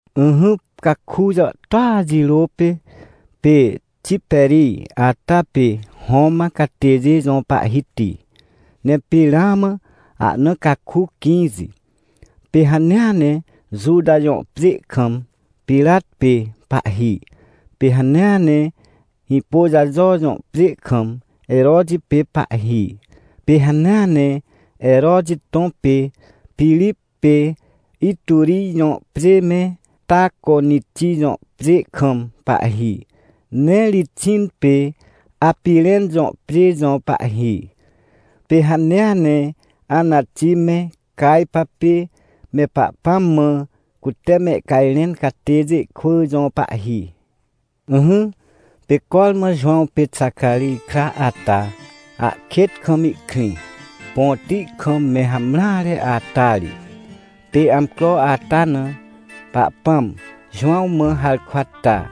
Ỹhỹ, caku jàhtôa jirô pê, pê Tiperij ata pê Roman catêjê jõ pahhiti, ne pê ramã ahna caku quĩxi, pê hanea ne Juta jõ pjê kam Pirat pê pahhi. Pê hanea ne Hĩpôjajo jõ pjê kam Heroti pê pahhi. Pê hanea ne Heroti tõ pê Pirip pê Iturij jõ pjê me Taconiti jõ pjê kam pahhi, ne Rixin pê Apirẽn jõ pjê jõ pahhi. Pê hanea ne Anati me Cajpa pê me Pahpãm mã cute mehcajrẽn catêjê kwỳ jõ pahhi. Ỹhỹ, pê cormã Jowãw pê Xacarij kra ata, ahkêt kam ihkrĩ, põti kam me hamreare ata ri. Pê amcro ata na, Pahpãm Jowãw mã harkwa ta,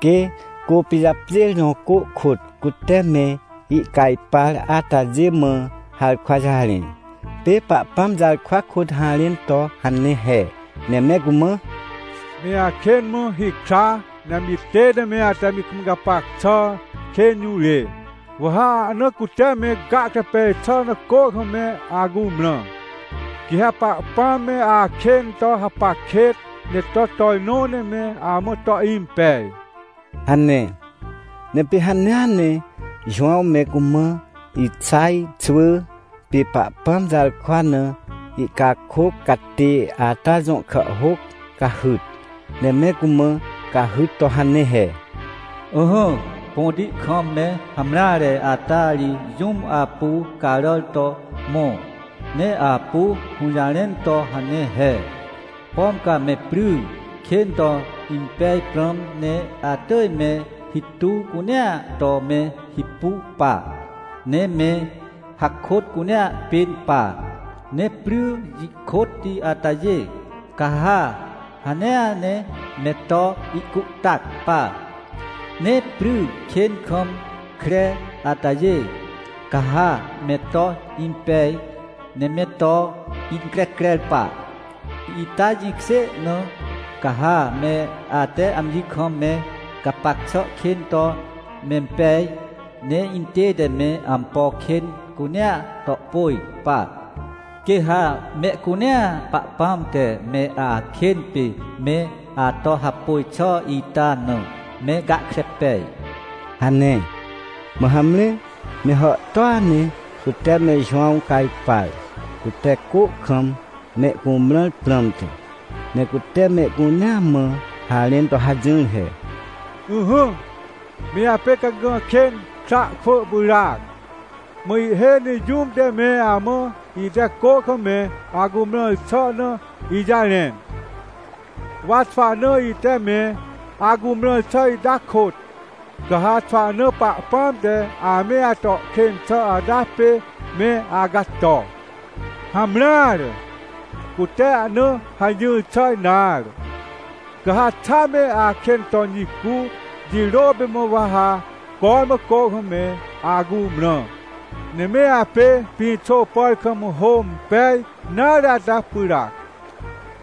quê Côpijapjêr jõ cô kôt cute me ihcajpar atajê mã harkwa jarẽ. Pê Pahpãm jarkwa kôt harẽn to hane he, ne me cumã: ― Me akên mã hikra, ne amji tête me ate amji kam me gapac xà kên jũrê, wa ha ahna cute me gahkre pej xà na cô kam me acumrã, quê ha Pahpãm me akên to hapac kêt, ne to tojnõ ne me amã to impej ― hane. Ne pê hanea ne Jowãw me cumã Ixaj xwỳ pê Pahpãm jarkwa na ihcakôc catê ata jõ kàhhôc cahyt. Ne me cumã cahyt to hane he: “Ỹhỹ, põti kam me hamreare ata ri jũm apu caràr to mõ, ne apu hũjarẽn to hane he: ‘Pom ca me pry kên to impej prãm ne atỳj me hituw cunea to me hipu pa, ne me hakôt cunea pên pa, ne pry jikôtti atajê, ca ha hanea ne me to ihcuhtac pa, ne pry kên kam kre atajê, ca ha me to impej ne me to increcrer pa. Ita jĩkjê na, ca ha me ate amji kam me gapac xà kên to mempej, ne intête me ampo kên cunea to pôj pa. Quê ha mehcunea Pahpãm te me akên pê me ato hapôj xà ita na, me gahkre pej’” hane. Mã hamre, me hàhtôa ne cute me Jowãw cajpar, cute cô kam mehcumrãr prãmte. Ne cute mehcunea mã harẽn to hajỹr he: ― Ỹhỹ, me apê cagã kên kra kwỳ pyràac! Mã ihhêj ne jũm te me amã ite cô kam me acumrãr xà na ijarẽn. Wa xwahna ite me acumrãr xà ita kôt, ca ha xwahna Pahpãm te ame ato kên xà ata pê me acato. Hamreare, cute ahna hajỹr xà nare! Ca ha xa me akên ton jicu, jirô pê mã wa ha cormã cô kam me acumrã. Ne me apê pĩxô pàr kam hô impej nare ata pyràac,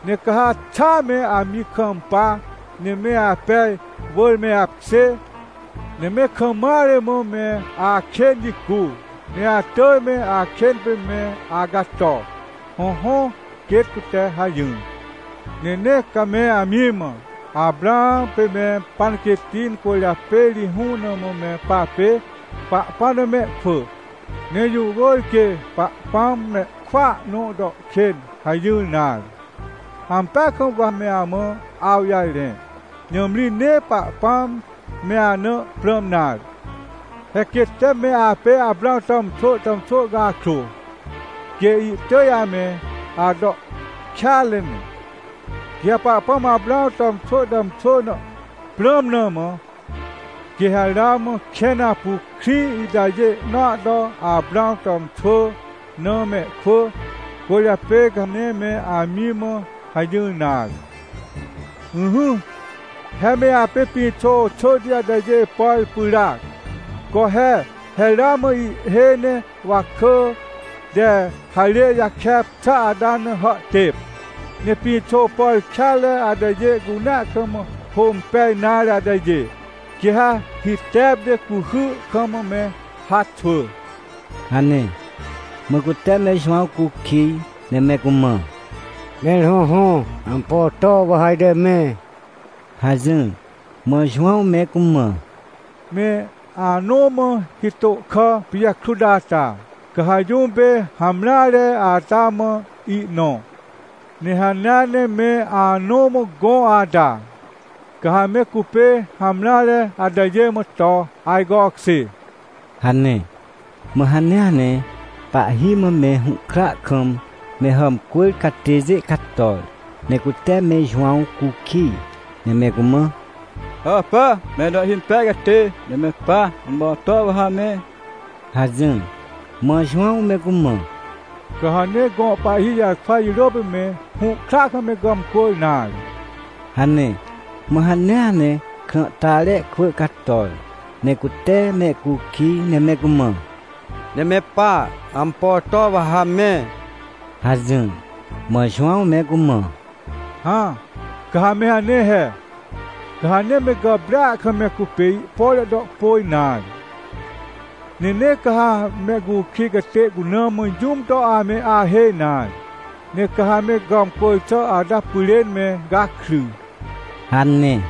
ne ca ha xaa me amji kampa, ne me apej wỳr me apkjê, ne me kam mare mã me akên jicu, ne atỳj me akên pê me acato. Hõhõ, quêt cute hajỹr. Ne nee ca me amji mã: “Aprãw pê me panquêtti, incwỳrjapê ri hũne mã me papê Pahpãm na mehkwỳ, ne jũ wỳr quê Pahpãm mehkwỳa nõ to kên” hajỹr nare. Ampeaj kam wa me amã awjarẽ. Nãmri nee Pahpãm me ana prãm nare, he quê tee me apê Aprãw tàmxwỳ tàmxwỳ cakrô, quê ihtỳj ame ato kêanre ne. Quê Pahpãm Aprãw tàmxwỳ tàmxwỳ na prãm na mã, quê ha ramã kẽn apu krĩ itajê nõa to Aprãw tàmxwỳ na mehkwỳ. Cwỳrjapê ca nee me amji mã hajỹr nare. ― Ỹhỹ, he me apê pĩxô xỳhti atajê pàr pyràac. Co he! He ramã ihhêj ne wakỳ te harê jakep xà ata na hàhtêp. Ne pĩxô pàr kêanre atajê cunea kam hô impej nare atajê, quê ha hitep ne cuhy kam me haxwỳ ― hane. Mã cute me Jowãw cukij, ne me cumã: ― Mẽr hõhõ, ampo to wa ha ajte me? ― hajỹr. Mã Jowãw me cumã: ― Me anõ mã hitô kà pijakrut ata, ca ha jũm pê hamreare ata mã ihnõ. Ne hanea ne me anõ mã gõ ata, ca ha me cupê hamreare atajê mã to ajcokjê ― hane. Mã hanea ne pahhi mã me hũhkra kam me hàmcwỳr catêjê cator, ne cute me Jowãw cukij, ne me cumã: ― Hàpà, me to ihhimpej catê, ne me pa, ampo to wa ha me? ― hajỹr. Mã Jowãw me cumã: ― Ca ha nee gõ pahhi jarkwa jirôa pê me hũhkra kam me gàmcwỳr nare ― hane. Mã hanea ne krãhtare kwỳ cator, ne cute mehcukij, ne me cumã: ― Ne me pa, ampo to wa ha me? ― hajỹr. Mã Jowãw me cumã: ― Hã, ca ha me hane he, ca ha nee me gàprêa kam me cupê ihpore to pôj nare. Ne nee ca ha mehcukij catê cuna mã jũm to ame ahêj nare. Ne ca ha me gàmcwỳr xà ata pyrên me gakry ― hane.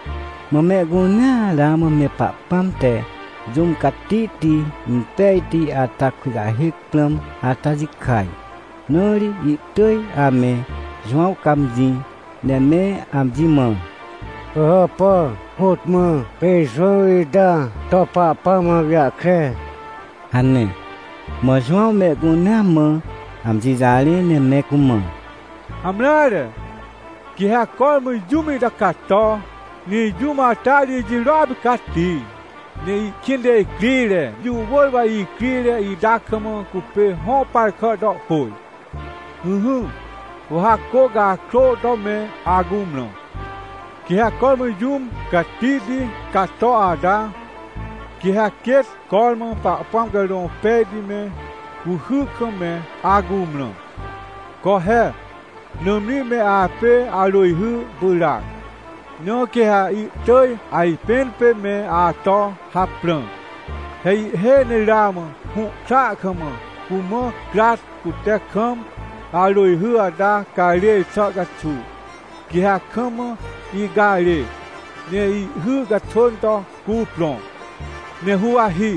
Mã mehcunea ramã me Pahpãm te jũm catihti impejti ata kujahêc prãm ata jikaj, na ri ihtỳj ame Jowãw cãmjĩ, ne me amji mã: ― Pỳhàpà, côt mã pê Jowãw ita to Pahpãm awjahkre? ― hane. Mã Jowãw mehcunea mã amji jarẽ ne me cumã: ― Hamreare, quê ha cormã jũm ita cato, ne jũm ata ri ijirôa pê cati, ne ihkĩnte icrire. Jũ wỳr wa icrire ita kam cupê hõ par kà to pôj. Ỹhỹ, wa ha cô cakrô to me acumrã, quê ha cormã jũm catihti cato ata, quê ha quêt cormã Pahpãm Carõ Pejti me, cuhy kam me acumrã. Co he, nãmri me apê arỳjhy pyràac. Na quê ha ihtỳj ajpẽn pê me ato haprã. He ihhêj ne ramã hũhkra kam cumã crat cute kam arỳjhy ata carêr xà caxuw. Quê ha kam ihcarê, ne ihhy caxwỳn to cuprõ, ne huwahi,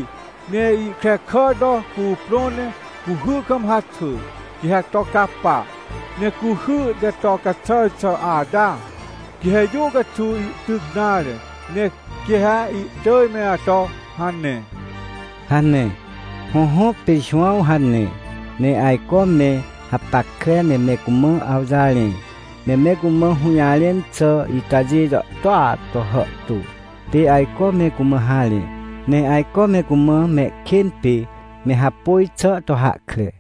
ne ihkrekà to cuprõ ne cuhy kam haxwỳ, quê ha to capa. Ne cuhy te to caxàr xà ata, quê ha jũ caxuw ihtyc nare. Ne quê ha ihtỳj me ato hane ― hane. Hõhõ, pê Jowãw hane, ne ajco me hapackre ne me cumã awjarẽ. Ne me cumã hũjarẽn xà itajê jàhtôa to hàhtô, pê ajco me cumã harẽ. Ne ajco me cumã mehkên pê me hapôj xà to hahkre.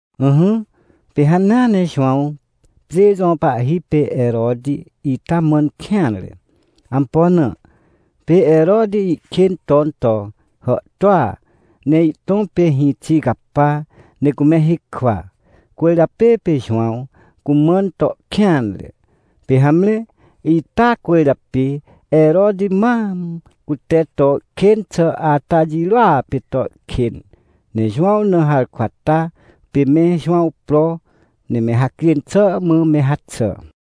Ỹhỹ, pê hanea ne Jowãw pjê jõ pahhi pê Heroti ita mãn kêanre. Ampo na? Pê Heroti ihkên ton to hàhtôa, ne ihtõ pê hĩxi capa, ne cume hikwa, cwỳrjapê pê Jowãw cumãn to kêanre. Pê hamre ita cwỳrjapê Heroti mam cute to kên xà ata jirôa pê to kên, ne Jowãw na harkwa ta, pê me Jowãw pro, ne me hacjên xà mã me haxà.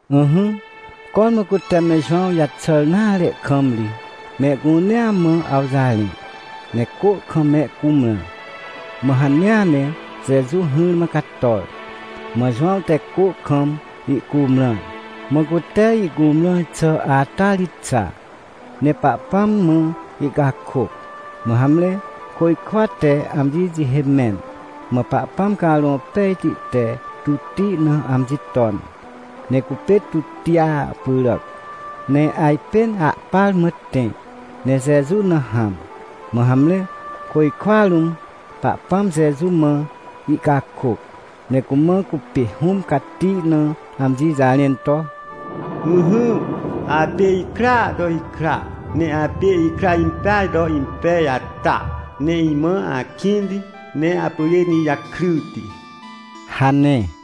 Ỹhỹ, cormã cute me Jowãw jaxàr nare kam ri mehcunea mã awjarẽ, ne cô kam me cumrã. Mã hanea ne Jeju hỹrmã cator, mã Jowãw te cô kam ihcumrãr. Mã cute ihcumrãr xà ata ri xa, ne Pahpãm mã ihcakôc. Mã hamre, côjkwa te amji jihê mẽn, mã Pahpãm Carõ Pejti te tutti na amji ton, ne cupê tuttia pyràc, ne ajpên ahpar mã tẽ, ne Jeju na hãm. Mã hamre, côjkwa rũm Pahpãm Jeju mã ihcakôc, ne cumã cupê Hũm Cati na amji jarẽn to: ― Ỹhỹ, apê ikraa to ikra, ne apê ikra impeaj to impej ata, ne imã akĩnti, ne apyrên ijakryti ― hane.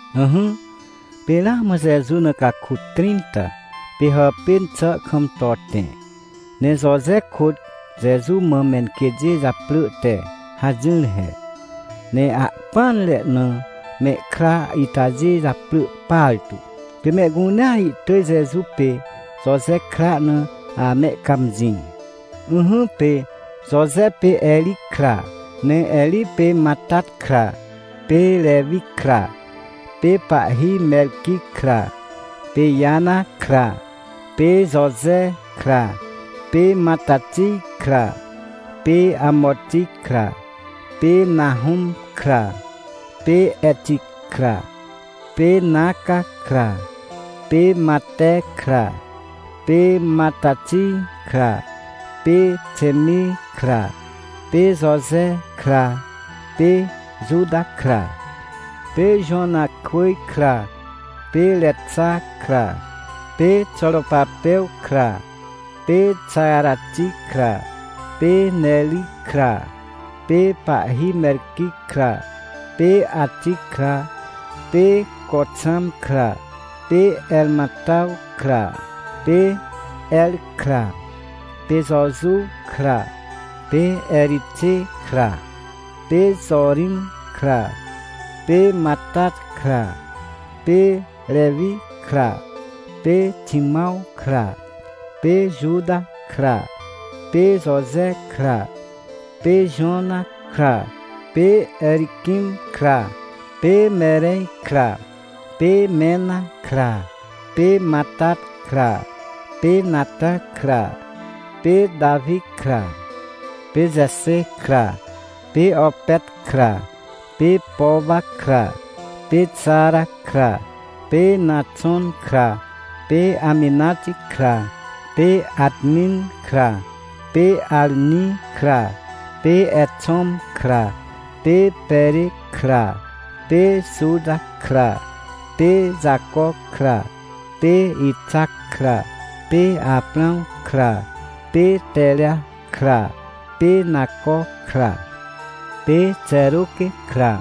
Ỹhỹ, pê ramã Jeju na caku trĩnta pê hàpên xà kam to tẽ, ne Joje kôt Jeju mã menquêtjê japrỳ te hajỹr he, ne ahpỹanre na mehkra itajê japrỳ partu. Pê mehcunea ihtỳj Jeju pê Joje kra na amehcãmjĩ. Ỹhỹ, pê Joje pê Eri kra, ne Eri pê Matat kra, pê Rewi kra, pê pahhi Merqui kra, pê Jana kra, pê Joje kra, pê Matatij kra, pê Amoti kra, pê Nahũm kra, pê Eti kra, pê Naca kra, pê Mate kra, pê Matatij kra, pê Xemi kra, pê Joje kra, pê Juta kra, pê Jowanakwỳj kra, pê Rexa kra, pê Xoropapew kra, pê Xarati kra, pê Neri kra, pê Pahhi Merqui kra, pê Ati kra, pê Coxam kra, pê Ermatãw kra, pê Er kra, pê Jojuw kra, pê Erixê kra, pê Jorim kra, pê Matat kra, pê Rewi kra, pê Ximãw kra, pê Juta kra, pê Joje kra, pê Jonã kra, pê Eriquim kra, pê Merej kra, pê Mena kra, pê Matat kra, pê Natã kra, pê Tawi kra, pê Jexê kra, pê Opet kra, pê Powa kra, pê Xara kra, pê Naxon kra, pê Aminati kra, pê Atmin kra, pê Arni kra, pê Exom kra, pê Pere kra, pê Juta kra, pê Jaco kra, pê Ixac kra, pê Aprãw kra, pê Tera kra, pê Naco kra, pê Xeruque kra,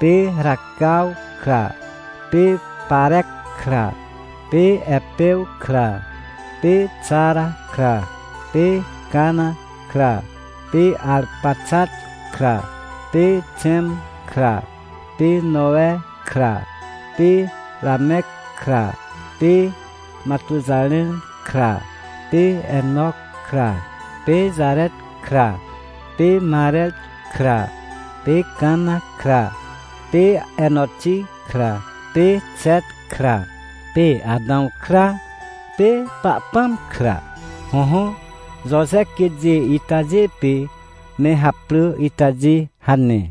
pê Racaw kra, pê Parec kra, pê Epew kra, pê Xara kra, pê Cana kra, pê Arpaxat kra, pê Xẽm kra, pê Nowe kra, pê Ramec kra, pê Matuxarem kra, pê Enoc kra, pê Jaret kra, pê Marer kra, pê Cana kra, pê Enotti kra, pê Xet kra, pê Atãw kra, pê Pahpãm kra. Hõhõ, Joje quêtjê itajê pê me haprỳ itajê hane.